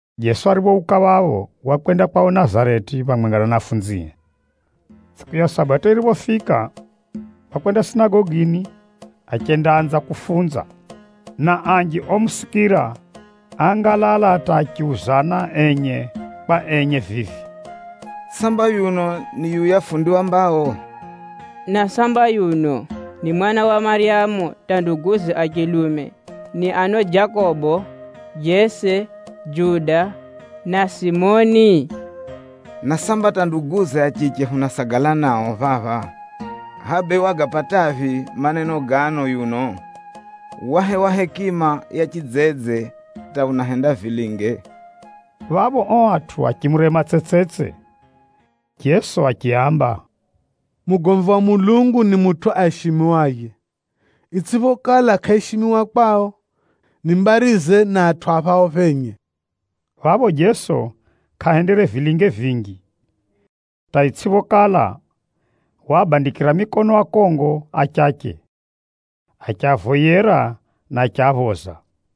Jeso ariphouka phapho, wakwenda kwao Nazareti phamwenga na anafunzie. Tsʼiku ya Sabato yiriphofika, wakwenda sinagogini achendaanza kufunza. Na anji omusikira, áangalala hata achiuzana enye kwa enye vivi, “Samba yuno, ni yuya fundi wa mbao? Na samba yuno ni mwana wa Maryamu hata nduguze a chilume ni ano Jakobo, Jose, Juda na Simoni? Na samba hata nduguze a chiche hunasagala nao phapha? Hʼaya bee, wagapataphi maneno gano yuno? Wahewa hekima ya chidzedze hata unahenda vilinge?” Phapho ao atʼu achimurema tsetsetse. Jeso yiye achiaamba, “Mugomvi wa Mulungu ni mutʼu aishimiwaye, itsʼiphokala, kʼaishimiwa kwao, ni mbarize na atʼu a phao phenye.” Phapho Jeso kʼahendere vilinge vinji, hata itsʼiphokala, waabandikira mikono akongo achache, achiavoyera na achiaphoza.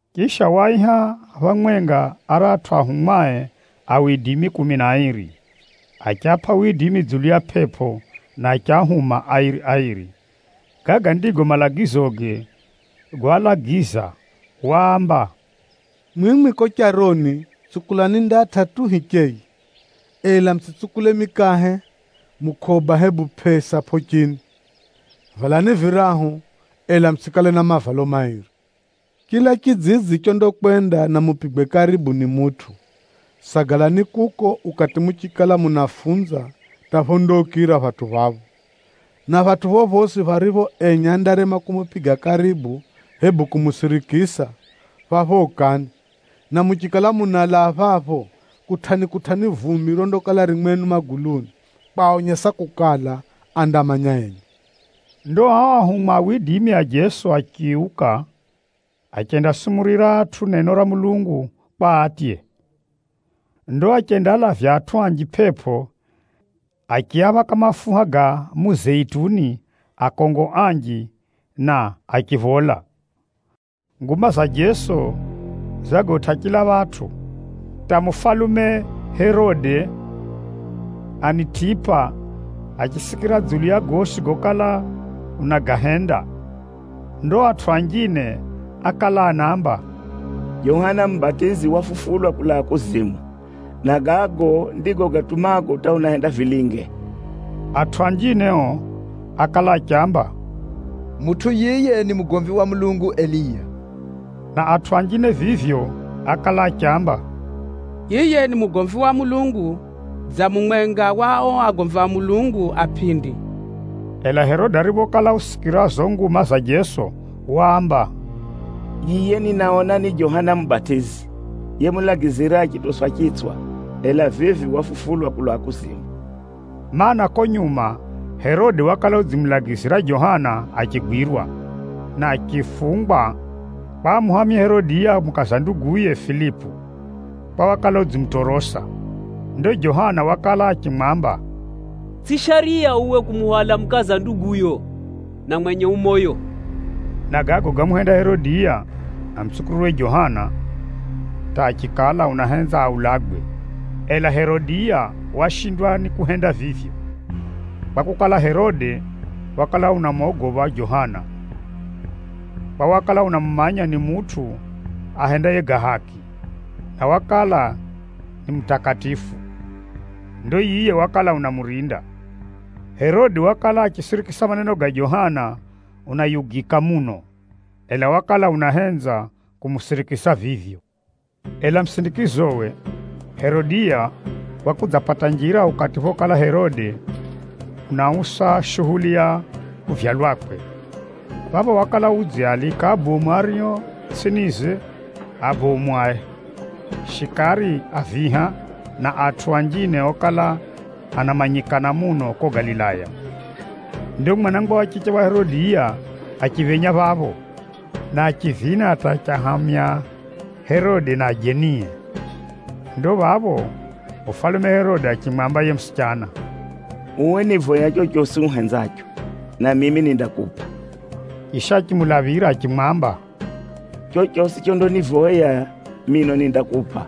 Chisha, waaiha phamwenga aratʼu anafunzie kumi na airi, achiapʼa widimi dzulu ya pʼepʼo, na achiahuma airi-airi. Gaga ndigo malagizoge goalagiza. Waamba, “Mwimwi kuko charoni, tsukulani ndatʼa tu hicheye, ela mutsʼitsukule mikahe, mukʼoba hebu pʼesa pʼochini. Valani virahu, ela mutsʼikale na mavalo mairi. Chila chidzidzi chondakwenda na mupigwe karibu ni mutʼu, sagalani kuko ukati muchikala munafunza hata phondaukira phatʼu phapho. Na phatʼu phophosi pharipho enye andarema kumupiga karibu hebu kumusirikisa, phapho ukani, na muchikala munalaa phapho, kutʼani-kutʼani vumbi rondakala ririro mwenu maguluni, kwaonyesa kukala, andamanya enye.” Ndo ao anafunzi a Jeso achiuka, achendasumurira atʼu neno ra Mulungu kwa atye. Ndo achendaalavya atʼu anji pʼepʼo, achiaphaka mafuha ga muzeituni akongo anji na achiphola. Nguma za Jeso zagotʼa chila phatʼu, hata mufalume Herode Anitipa achisikira dzulu ya gosi gokala unagahenda. Ndo atʼu anjine ákala anaamba, Nakala zinjine zinaamba: yiye wakala unaamba, “Johana Mubatizi wafufulwa kulaa kuzimu, na gago ndigo gatumago hata unahenda vilinge.” Atʼu anjine ao ákala achiamba, “Mutʼu yiye ni mugomvi wa Mulungu Eliya.” Na atʼu anjine vivyo ákala achiamba, “Yiye ni mugomvi wa Mulungu dza mumwenga wa ao agomvi a Mulungu a pʼindi.” Ela Herode ariphokala usikira zizo nguma za Jeso, waamba, “Yiye, ninaona ni Johana Mubatizi, yemulagizira achitoswa chitswa, ela vivi wafufulwa kulaa kuzimu!” Maana, kuko nyuma Herode wakala udzimulagizira Johana achigwirwa, na achifungwa, kwa amuhamye Herodiya mukaza nduguye Filipu, kwa wakala udzimutorosa. Ndo Johana wakala achimwamba, “Tsʼiyo shariya uwe kumuhwala mukaza nduguyo, na mwenye ucheri moyo!” Na gago gámuhenda Herodiya amutsukirirwe Johana, hata achikala unahenza aulagwe. Ela Herodiya washindwa ni kuhenda vivyo, kwakukala, Herode wakala unamogopha Johana, kwa wakala unamumanya ni mutʼu ahendaye ga haki, na wakala ni mutakatifu. Ndo yiye wakala unamurinda. Herode wakala achisirikisa maneno ga Johana unayugika muno, ela wakala unahenza kumusirikisa vivyo. Ela musindikizowe, Herodiya wakudzapata njira ukati phokala Herode unausa shuhuli ya kuvyalwakwe. Phapho wakala udziaalika abomu ario tsʼinize, abomu a shikari a viha, na atʼu anjine okala anamanyikana muno kuko Galilaya. Ndo mwanangwa wa chiche wa Herodiya achiphenya phapho, na achivina hata achiahamya Herode na ajenie. Ndo phapho, mufalume Herode achimwamba yiye musichana, “Uwe nivoya chochosi uhenzacho, na mimi nindakupʼa.” Chisha achimulaphira achimwamba, “Chochosi chondanivoya mino nindakupʼa,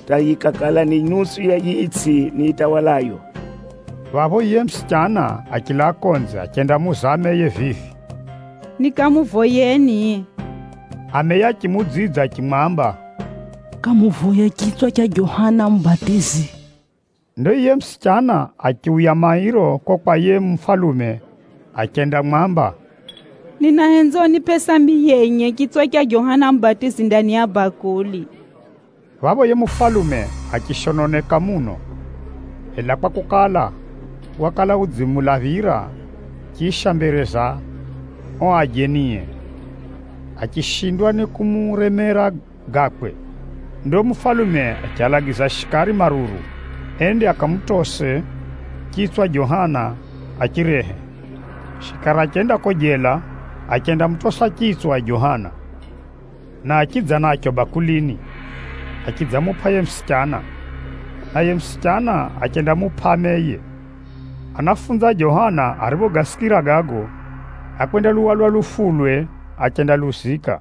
hata yikakala ni nusu ya yiyi itsʼi nitawalayo.” Phapho yiye musichana achilaa konze achendamuuza ameye vivi, “Nikamuvoyeni?” Ameye achimuudzidza achimwamba, “Kamuvoye chitswa cha Johana Mubatizi.” Ndo yiye musichana achiuya mairo kuko kwa yiye mufalume achendamwamba, “Ninahenza unipʼe sambi yenye, chitswa cha Johana Mubatizi ndani ya bakuli.” Phapho yiye mufalume achishononeka muno. Ela kwakukala, wakala udzimulaphira, chisha mbere za ao ajenie, achishindwa ni kumuremera gakwe. Ndo mufalume achialagiza shikari maruru, ende akamutose chitswa Johana achirehe. Shikari achenda kuko jela, achendamutosa chitswa Johana, na achidza nacho bakulini, achidzamupʼa yiye musichana, naye musichana achendamupʼa ameye. Anafunzi a Johana ariphogasikira gago, ákwendaluhwala lufulwe, achendaluzika.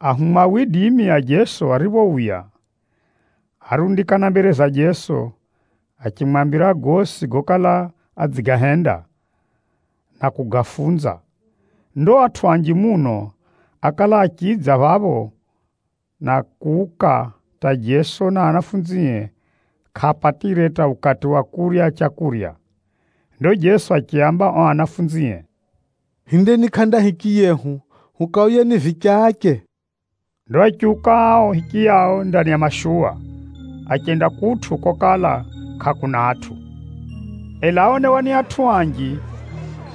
Ahumwa a Jeso ariphouya, árundikana mbere za Jeso achimwambira gosi gokala adzigahenda, na kugafunza. Ndo atʼu anji muno ákala achidza phapho na kuuka hata Jeso na anafunzie kʼaapatire hata ukati wa kurya leu. Ndo Jeso achiaamba ao anafunzie, “Hindeni kʼanda hichiyehu, hukaoyeni vichache.” Ndo achiuka ao hichiyao ndani ya mashuwa, achenda kutʼu kokala kʼakuna atʼu. Ela áonewa ni atʼu anji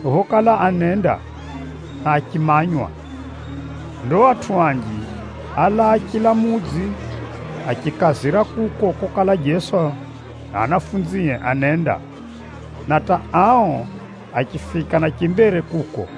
phokala anenda, na achimanywa. Ndo atʼu anji álaa chila mudzi achikazira kuko kokala Jeso na anafunzie anenda, na hata ao achifika na chimbere kuko.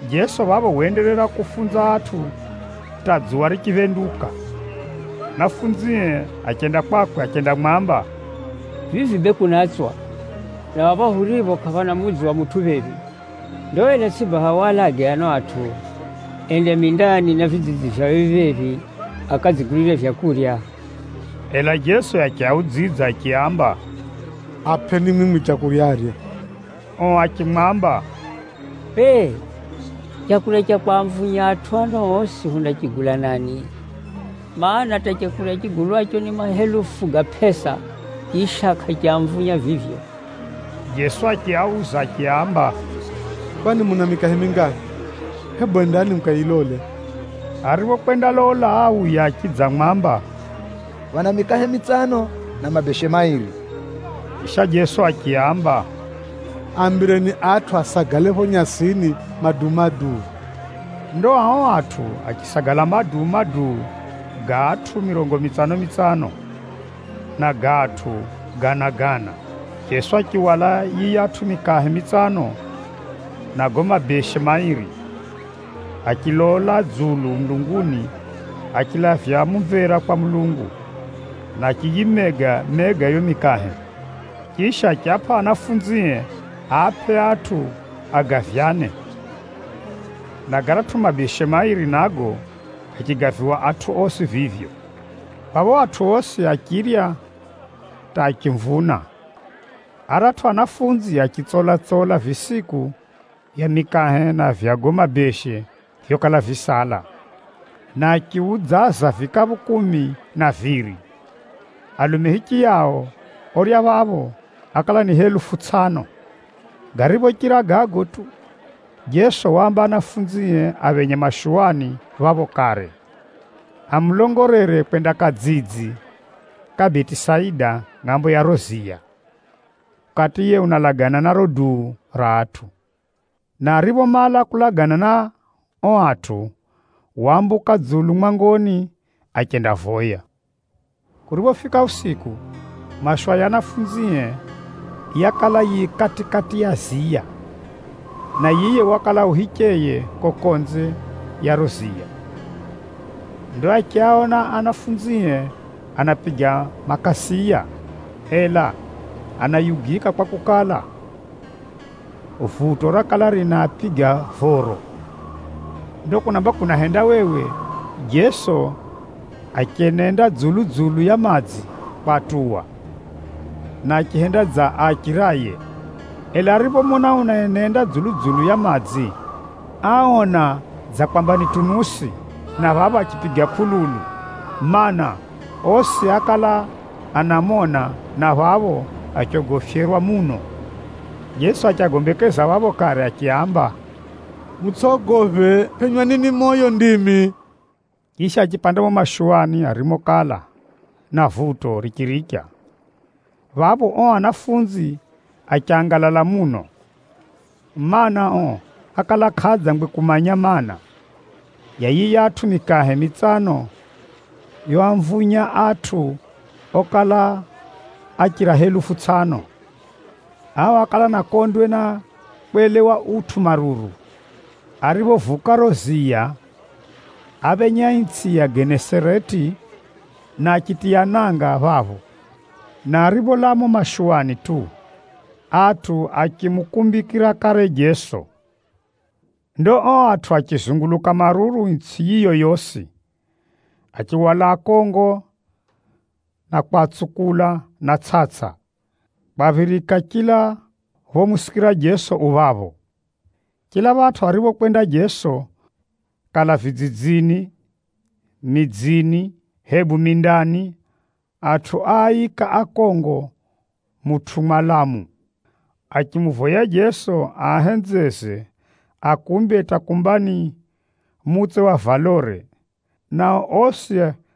Jeso phapho waenderera kufunza atʼu, hata dzuwa richiphenduka. Anafunzie achenda kwakwe achendamwamba, “Vivi bee kunatswa, na phapha huripho kʼaphana mudzi wa mutʼu phephi. Ndo ela tsʼi baha walage ano atʼu, ende mindani na vidzidzi virivyo phephi-phephi, akadzigulire vyakurya?” Ela Jeso yiye achiaudzidza achiaamba, “Apʼeni mwimwi leu arye.” Ao achimwamba, “Bee, leu ra kwamvunya atʼu ano osi hundachigula nani? Maana, hata leu rigulwaro ni mahelufu ga pʼesa, chisha kʼariamvunya vivyo!” Jeso achiauza achiaamba, “Kwani muna mikahe mingaphi? Hebu endani mukayilole.” Ariphokwendalola, áuya achidzamwamba, “Phana mikahe mitsano, na mabeshe mairi.” Chisha Jeso achiaamba, “Aambireni atʼu asagale phapho nyasini maduu-maduu.” Ndo ao atʼu achisagala maduu-maduu ga atʼu mirongo mitsano-mitsano, na ga atʼu gana-gana. Jeso achihwala yiyatʼu mikahe mitsano na gago mabeshe mairi, achilola dzulu mulunguni achilavya mumvera kwa Mulungu, na achiyimega-mega yiyo mikahe. Chisha, achiapʼa ao anafunzie aapʼe atʼu agavyane. Na garatʼu mabeshe mairi nago, gachigaviwa atʼu osi vivyo. Phapho atʼu osi achirya hata achimvuna. Aratʼu anafunzi achitsola-tsola visiku vya mikahe na vya gago mabeshe vyokala visala, na achiudzaza vikaphu kumi na viri. Alume hichiyao orya phapho, ákala ni helufu tsʼano. Gariphochira gago tu, Jeso waamba anafunzie aphenye mashuwani phapho kare, amulongolere kwenda kadzidzi kariko Betisaida ngʼambo ya riro ziya, ukati yiye unalagana na riro duu ra atʼu. Na ariphomala kulagana na ao atʼu, waambuka dzulu mwangoni, achendavoya. Kuriphofika usiku, mashuwa ya anafunzie yakala yifika kati-kati ya ziya, na yiye wakala u hicheye kuko konze ya riro ziya. Ndo achiaona anafunzie anapiga makasiya, ela anayugika kwakukala, vuto rakala rinaapiga voro. Ndo kunamba kunahendawewe, Jeso achenenda dzulu-dzulu ya madzi kwatuwa, na achihenda dza aachiraye. Ela ariphomona unaenenda dzulu-dzulu ya madzi, áona dza kwamba ni tunusi, na phapho achipiga kʼululu, mana, osi ákala anamona, na phapho achogofyerwa muno. Jeso achiagombekeza phapho kare achiaamba, “Mutsʼogophe, phenywani ni moyo ndimi!” Chisha achiphenya mumo mashuwani arimokala, na vuto richiricha. Phapho, ao anafunzi achangalala muno, mana, ao ákala kʼaadzangwe kumanya maana, ya yiyatʼu mikahe mitsano yoamvunya atʼu okala achira helufu tsʼano. Ao ákala ana kondwe na kwelewa utʼu maruru. Ariphovuka riro ziya, áfika itsʼi ya Genesareti, na achitiya nanga phapho. Na aripholaa mumo mashuwani tu, atʼu achimukumbikira kare Jeso. Ndo ao atʼu achizunguluka maruru itsʼi yiyo yosi, achihwala akongo na kwatsukula na tsʼatsʼa, kwaphirika chila phomusikira Jeso u phapho. Chila phatʼu arikokwenda Jeso, kala vidzidzini, midzini hebu mindani, atʼu áika akongo mutʼu mwalamu, achimuvoya Jeso aahenzeze akumbe hata kumba ni mutse wa valore, nao osi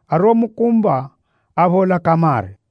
ariomukumba, áphola kamare.